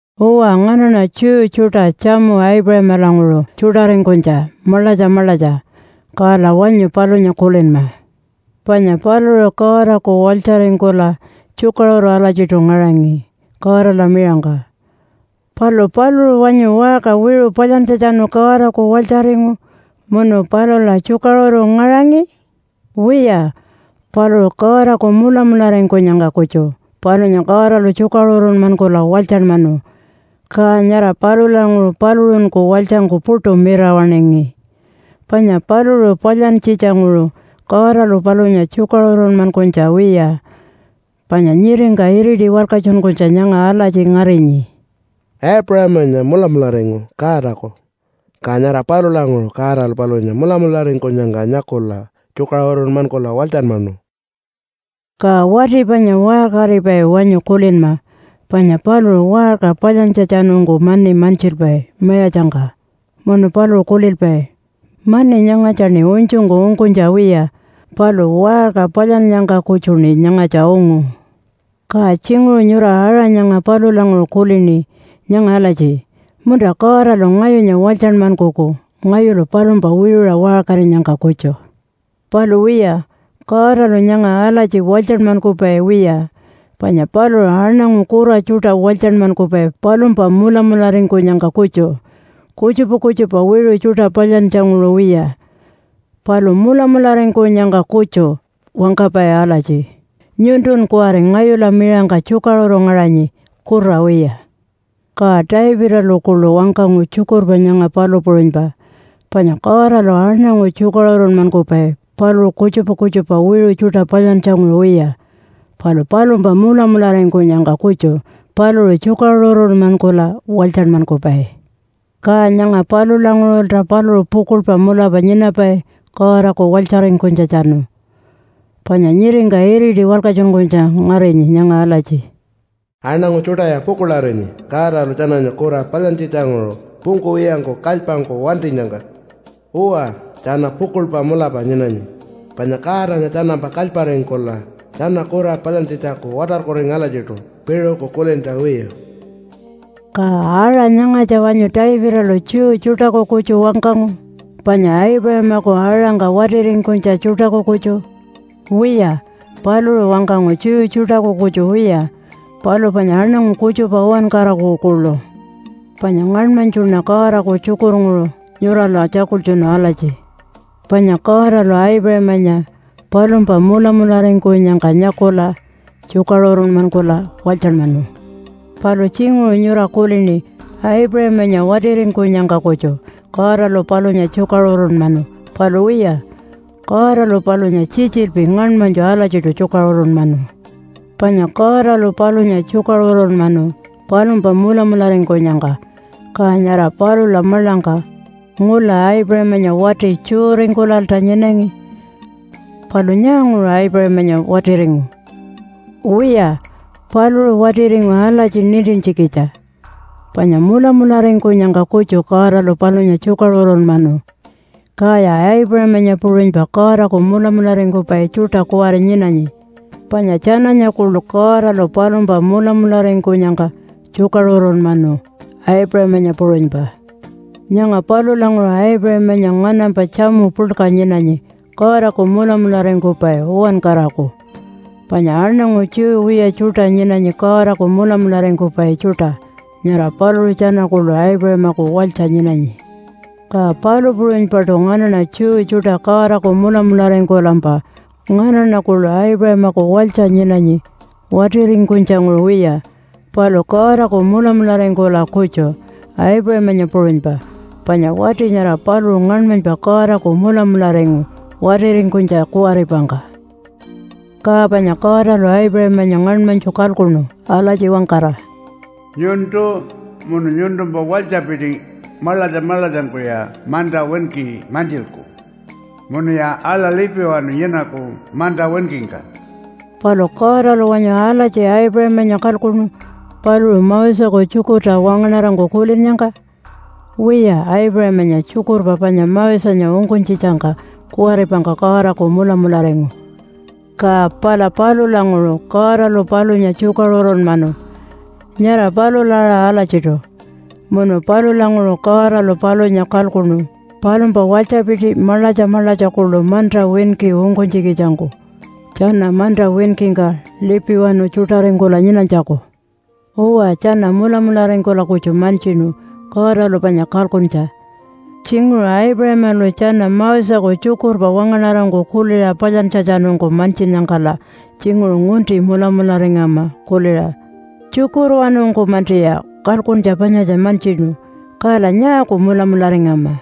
Uwa, nganaṉa Jew tjuṯa tjamu Aipuṟamalanguṟu tjuṯaringkunytja maḻatja maḻatja. Kala wanyu palunya kulinma. Panya paluṟu Godaku walytjaringkula tjukaṟuru alatjiṯu ngaṟangi Godala miṟangka. Palu paluṟu wanyu waṟka wiṟu palyantjatjanu Godaku walytjaringu munu palula tjukaṟuru ngaṟangi? Wiya, paluṟu Godaku mulamularingkunyangka kutju palunya Godalu tjukaṟurunmankula walytjanmanu. Ka nyara palulanguṟu paluṟunku walytjangku puṯu mirawaṉingi, panya paluṟu palyantjitja-nguṟu Godalu palunya tjukaṟurunmankunytja wiya. Panya nyiringka iriti walkatjunkunytja nyanga alatji ngarinyi, “Aipuṟamanya mulamularingu Godaku. Ka nyara palulanguṟu Godalu palunya mulamularingkunyangka nyakula tjukaṟurunmankula walytjanmanu.” Ka wati panya waṟkaripai wanyu kulinma, panya paluṟu waṟka palyantjatjanungku mani mantjilpai mayatjangka, munu paluṟu kulilpai, “Mani nyangatjaṉi unytjungku ungkunytja wiya, palu waṟka palyannyangka kutjuṉi nyangatja ungu.” Ka tjinguṟu nyura aṟa nyanga palulanguṟu kulini nyanga alatji, “Munta Godalu ngayunya walytjanmankuku ngayulu palumpa wiṟuṟa waṟkarinyangka kutju.” Palu wiya, Godalu nyanga alatji walytjanmankupai wiya. Panya paluṟu aṉangu kura tjuṯa walytjanmankupai palumpa mulamularingkunyangka kutju, kutjupa kutjupa wiṟu tjuṯa palyantjanguṟu wiya. Palu mulamularingkunyangka kutju wangkapai alatji, “Nyuntun kuwari ngayula miṟangka tjukaṟuru ngaṟanyi, kura wiya.” Ka Davidalu kuḻu wangkangu tjukurpa nyanga palu puṟunypa. Panya Godalu aṉangu tjukaṟurunmankupai paluṟu kutjupa kutjupa wiṟu tjuṯa palyantjanguṟu wiya, palu palumpa mulamularingkunyangka kutju paluṟu tjukaṟurunmankula walytjanmankupai. Ka nyanga palulanguṟulta paluṟu pukuḻpa mulapa nyinapai Godaku walytjaringkunytjatjanu. Panya nyiringka iriti walkatjunkunytja ngarinyi nyanga alatji, “Aṉangu tjuṯaya pukuḻarinyi Godalu tjananya kura palyantjitjanguṟu pungkuwiyangku kalypangku wantinyangka. Uwa, tjana pukuḻpa mulapa nyinanyi, panya Godanya tjanampa kalyparingkula tjana kura palyantjitjaku watarkuringu alatjiṯu piṟuku kulintja wiya.” Ka aṟa nyangatja wanyu Davidalu Jew tjuṯaku kutju wangkangu panya Aipuṟamaku aṟangka watiringkunytja tjuṯaku kutju? Wiya, paluṟu wangkangu Jew tjuṯaku kutju wiya, palu panya aṉangu kutjupa uwankaraku kuḻu. Panya ngaṉmanytjuṉa Godaku tjukurnguṟu nyurala tjakultjunu alatji, “Panya Godalu Aipuṟamanya palumpa mulamularingkunyangka nyakula tjukaṟurunmankula walytjanmanu.” Palu tjinguṟu nyura kulini Aipuṟamanya watiringkunyangka kutju Godalu palunya tjukaṟurunmanu. Palu wiya, Godalu palunya tjitjilpi ngaṉmanytju alatjiṯu tjukaṟurunmanu. Panya Godalu palunya tjukaṟurunmanu palumpa mulamularingkunyangka, ka nyara palula maḻangka ngula Aipuṟamanya wati Jew-ringkulalta nyinangi. Palu nyaanguṟu Aipuṟamanya watiringu? Wiya, paluṟu watiringu alatji nintintjikitja panya mulamularingkunyangka kutju Godalu palunya tjukaṟurunmanu. Kaya Aipuṟamanya puṟunypa Godaku mulamularingkupai tjuṯa kuwari nyinanyi, panya tjananya kuḻu Godalu palumpa mulamularingkunyangka tjukaṟurunmanu Aipuṟamanya puṟunypa. Nyanga palulanguṟu Aipuṟamanya nganampa tjamu puḻka nyinanyi Godaku mulamularingkupai uwankaraku. Panya aṉangu Jew wiya tjuṯa nyinanyi Godaku mulamularingkupai tjuṯa, nyara paluṟu tjana kuḻu Aipuṟamaku walytja nyinanyi. Ka palu puṟunypaṯu nganaṉa Jew tjuṯa Godaku mulamularingkulampa nganaṉa kuḻu Aipuṟamaku walytja nyinanyi watiringkunytjanguṟu wiya, palu Godaku mulamularingkula kutju, Aipuṟamanya puṟunypa, panya wati nyara paluṟu ngaṉmanypa Godaku mulamularingu watiringkunytja kuwaripangka. Ka panya Godalu Aipuṟamanya ngaṉmanytju kalkuṉu alatji wangkara, “Nyuntu munu nyuntumpa walytjapiti maḻatja maḻatjangkuya manta winki mantjilku munuya aḻa lipiwanu nyinaku manta winkingka.” Palu Godalu wanyu alatji Aipuṟamanya kalkuṉu paluṟu Moseku tjukurta wangaṉarangku kulinnyangka? Wiya, Aipuṟamanya tjukurpa panya Mosenya ungkunytjitjangka kuwaripangka Godaku mulamularingu, ka pala palulanguṟu Godalu palunya tjukaṟurunmanu nyara palula aṟa alatjiṯu. Munu palulanguṟu Godalu palunya kalkuṉu palumpa walytjapiti maḻatja maḻatja kuḻu manta winki ungkunytjikitjangku tjana manta winkingka lipiwanu tjuṯaringkula nyinanytjaku. Uwa, tjana mulamularingkula kutju mantjinu Godalu panya kalkuntja. Tjinguṟu Aipuṟamalu tjana Moseku tjukurpa wangaṉarangku kuliṟa palyantjatjanungku mantjinnyangkala tjinguṟu ngunti mulamularingama kuliṟa, “Tjukurwanungku-mantiya kalkuntja panyatja mantjinu, kala nyaaku mulamularingama?”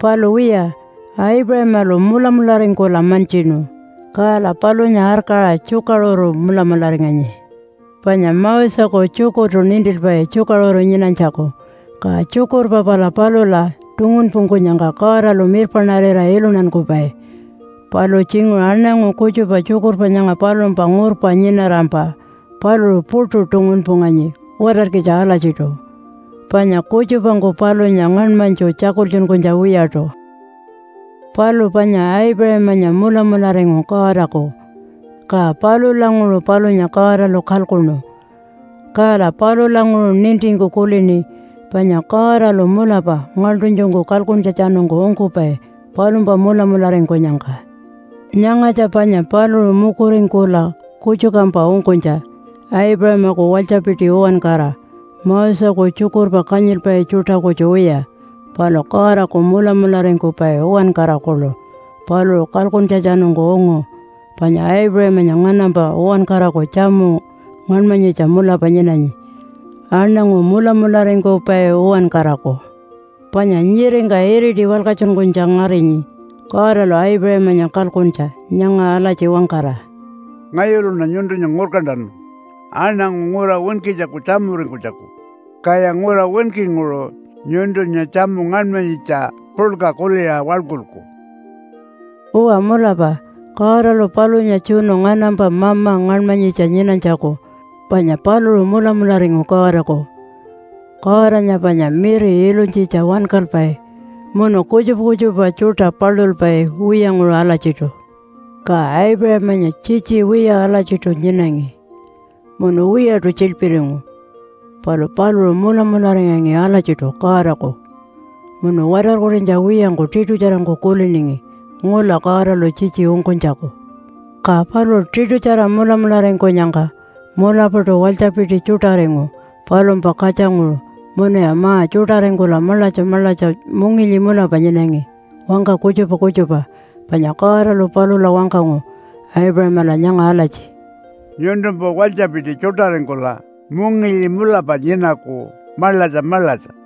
Palu wiya, Aipuṟamalu mulamularingkula mantjinu, kala palunya arkaṟa tjukaṟuru mulamularinganyi. Panya Moseku tjukurtu nintilpai tjukaṟuru nyinanytjaku, ka tjukurpa pala palula tungunpungkunyangka Godalu mirpaṉarira iluntankupai. Palu tjinguṟu aṉangu kutjupa tjukurpa nyanga palumpa ngurpa nyinarampa paluṟu puṯu tungunpunganyi watarkitja alatjiṯu, panya kutjupangku palunya ngaṉmanytju tjakultjunkunytja wiyaṯu. Palu panya Aipuṟamanya mulamularingu Godaku, ka palulanguṟu palunya Godalu kalkuṉu. Kala palulanguṟu nintingku kulini panya Godalu mulapa ngaḻṯunytjungku kalkuntjatjanungku ungkupai palumpa mulamularingkunyangka. Nyangatja panya paluṟu mukuringkula kutjukampa ungkunytja Aipuṟamaku walytjapiti uwankara, Moseku tjukurpa kanyilpai tjuṯa kutju wiya, palu Godaku mulamularingkupai uwankara kuḻu paluṟu kalkuntjatjanungku ungu. Panya Aipuṟamanya nganampa uwankaraku tjamu ngaṉmanyitja mulapa nyinanyi, aṉangu mulamularingkupai uwankaraku. Panya nyiringka iriti walkatjunkunytja ngarinyi Godalu Aipuṟamanya kalkuntja nyanga alatji wangkara, “Ngayuluṉa nyuntunya ngurkantanu aṉangu ngura winkitjaku tjamuringkunytjaku, kaya ngura winkinguṟu nyuntunya tjamu ngaṉmanyitja puḻka kuliṟa waḻkulku.” Uwa mulapa Godalu palunya tjunu nganampa mama ngaṉmanyitja nyinanytjaku, panya paluṟu mulamularingu Godaku. Godanya panya miri ilunytjitja wankalpai munu kutjupa kutjupa tjuṯa palulpai wiyanguṟu alatjiṯu. Ka Aipuṟamanya tjitji wiya alatjiṯu nyinangi munu wiyaṯu tjiḻpiringu, palu paluṟu mulamularingangi alatjiṯu Godaku, munu watarkurinytja wiyangku tiṯutjarangku kuliningi ngula Godalu tjitji ungkunytjaku. Ka paluṟu tiṯutjara mulamularingkunyangka mulapaṯu walytjapiti tjuṯaringu palumpa katjanguṟu munuya ma-tjuṯaringkula maḻatja maḻatja mungilyi mulapa nyinangi wangka kutjupa kutjupa. Panya Godalu palula wangkangu Aipuṟamala nyanga alatji, “Nyuntumpa walytjapiti tjuṯaringkula mungilyi mulapa nyinaku maḻatja maḻatja.”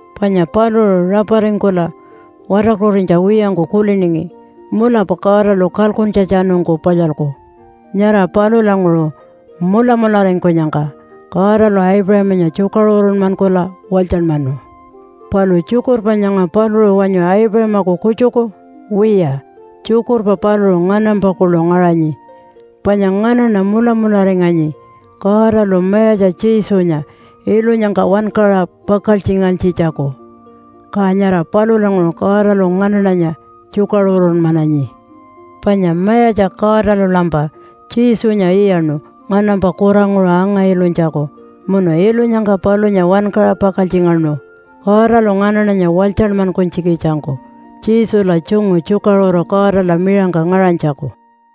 Panya paluṟu raparingkula watarkurinytja wiyangku kuliningi, “Mulapa Godalu kalkuntjatjanungku palyalku.” Nyara palulanguṟu mulamularingkunyangka Godalu Aipuṟamanya tjukaṟurunmankula walytjanmanu. Palu tjukurpa nyanga paluṟu wanyu Aipuṟamaku kutjuku? Wiya, tjukurpa paluṟu nganampa kuḻu ngaṟanyi. Panya nganaṉa mulamularinganyi Godalu Mayatja Jesunya ilunyangka wankaṟa pakaltjingantjitjaku. Ka nyara palulanguṟu Godalu nganaṉanya tjukaṟurunmananyi. Panya Mayatja Godalulampa Jesunya iyaṉu nganampa kuranguṟu anga-ilunytjaku, munu ilunyangka palunya wankaṟa pakaltjingaṉu Godalu nganaṉanya walytjanmankunytjikitjangku Jesula tjungu tjukaṟuru Godala miṟangka ngaṟanytjaku.